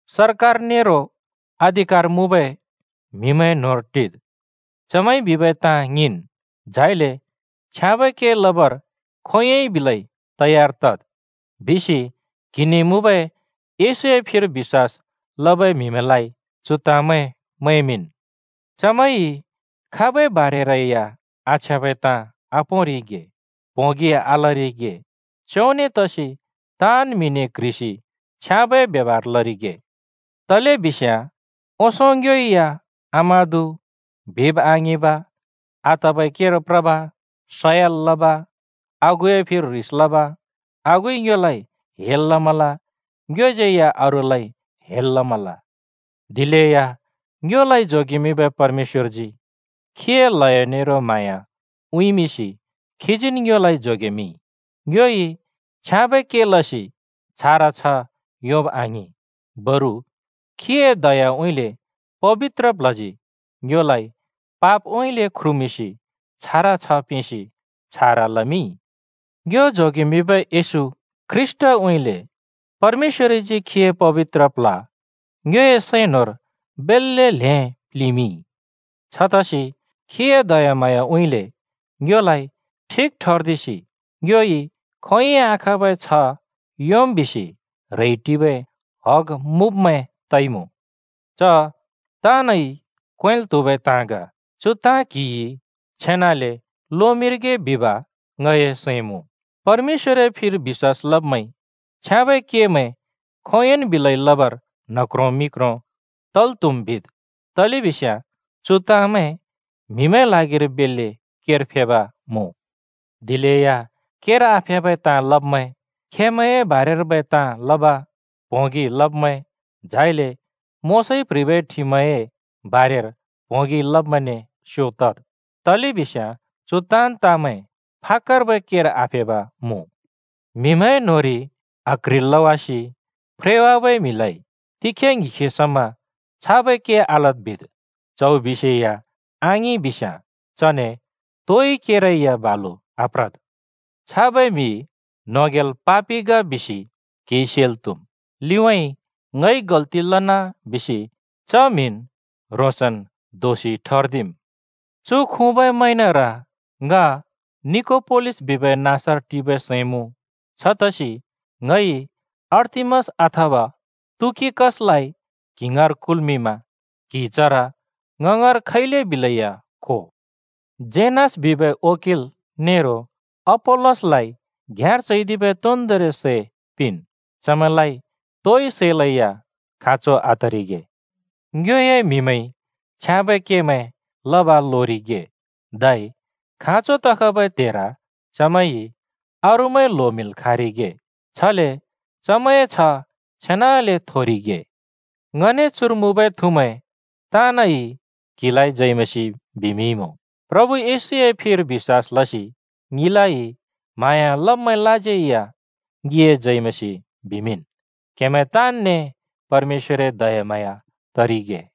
“सरकार नेरो अधिकार मुँबै म्हिमैंए न्होंर टिद्, चमैंइ बिबै ताँ ङिंन्, झाइले छ्याँबै के लबर खोंयोंइ बिलै तयार तद्,” बिसि क्‍हिने मुँबै येशूए फिर बिश्‍वास लबै म्‍हिमैंलाइ चु ताँमैं मैंमिंन्। चमैंइ खाबै बारेरै या आछ्याँबै ताँ आपोंरिगे, प्होंगि आलरिगे, च्योंने तसि ताँन् म्‍हिने क्‍ह्रिसि छ्याँबै ब्यबार लरिगे। तलेबिस्याँ ओंसों ङ्योइ या आमादु, बिब आङिंब, आतबै केर प्रब, सयल लब, आगुए फिर ह्रिस लब, आगुइ ङ्योलाइ हेल लमल, ङ्योज्यै या अरूलाइ हेल लमल। दिलेया ङ्योलाइ जोगेमिंबै परमेश्‍वरजी खीए ल्हयो नेरो म्हाँया उँइँमिंसि, खीजीन् ङ्योलाइ जोगेमिंइ। ङ्योइ छ्याँबै के लसि छारा छ्ह योंब आङिं, बरु खीए दयाउँइँले पबित्र प्ल्हजी ङ्योलाइ पापउँइँले ख्रुमिंसि छारा छ्ह पिंसि, छारा लमिंइ। ङ्यो जोगेमिंबै येशू ख्रीष्‍टउँइँले परमेश्‍वरजी खीए पबित्र प्ल्ह ङ्योए सैं न्‍होंर बेल्‍ले ल्हें प्‍लिंमिंइ। छतसि खीए दयाम्हाँयाउँइँले ङ्योलाइ ठिक ठर्दिसि ङ्योइ खोंयोंइ आखाँबै छ्ह योंम् बिसि ह्रेइ टिबै हग मुँब्मैं तइमुँ। च ताँनइ क्वेंल् त्हुबै ताँ ग। चु ताँ क्‍हिइ छेनाले लोमिंरिगे बिब ङए सैं मुँ। परमेश्‍वरए फिर बिश्‍वास लब्मैंइ छ्याँबै केमैं खोंयोंन् बिलै लबर न्ह क्रों मि क्रों तल् त्हुम्, बिद्, तलेबिस्याँ चु ताँमैं म्‍हिमैंए ल्हागिर बेल्‍ले केर फेब् मुँ। दिलेया केर आफेबै ताँ लब्‍मैं, खेमैंए बारेर्बै ताँ लब, प्होंगि लब्मैं, झाइले मोशाइ प्ह्रिबै ठिमए (नियमए) बारेर प्होंगि लब्मैंने स्‍यो तद्। तलेबिस्याँ चु ताँन् ताँमैं फाकर्बै केर आफेब् मुँ। म्‍हिमैंए न्होंरि आक्ह्रिसि फ्रेवाबै म्हिलाइ तिखे ङ्हिखे समा “छाबै के आलद्” बिद्, च्‍हौ बिसेया आङिं बिस्‍याँ चने तोइ केरै या बालु आप्रद्। छाबै म्‍हि न्होंग्याल पापि ग बिसि क्हिइ सेल् त्हुम्। लिउँइँ “ङइ गल्‍ति लना” बिसि च म्हिन् ह्रोंसन् दोषि ठर्दिम्। चु खुँबै म्हैंनर ङ निकोपोलिस बिबै नाँसर टिबै सैं मुँ। छतसि ङइ अर्तिमास अथवा तुखिकसलाइ क्हि ङाँर कुल्‍मिंमा क्हि चर ङ ङाँर खैले बिलेया खो। जेनास बिबै वकिल नेरो अपोल्‍लोसलाइ घ्‍याँर चैदिबै तोन्दोंरि सै पिंन्। चमैंलाइ तोइ सैलैया खाँचो आतरिगे। ङ्योए म्‍हिमैंइ छ्याँबै केमैं लब लोरिगे, धै खाँचो तखबै त्हेर चमैंइ अरूमैं ल्होमिंल् खाँरिगे, छले चमैंए छ्ह छेनाले थोरिगे। ङने चुर मुँबै थुमैं ताँनइ क्‍हिलाइ जय मसीह बिमिंइमुँ। प्रभु येशूए फिर बिश्‍वास लसि ङिलाइ म्हाँया लब्‍मैंलाज्यै या ङिए जय मसीह बिमिंन्। क्‍हेमैं ताँन्‍ने परमेश्‍वरए दयाम्हाँया तरिगे।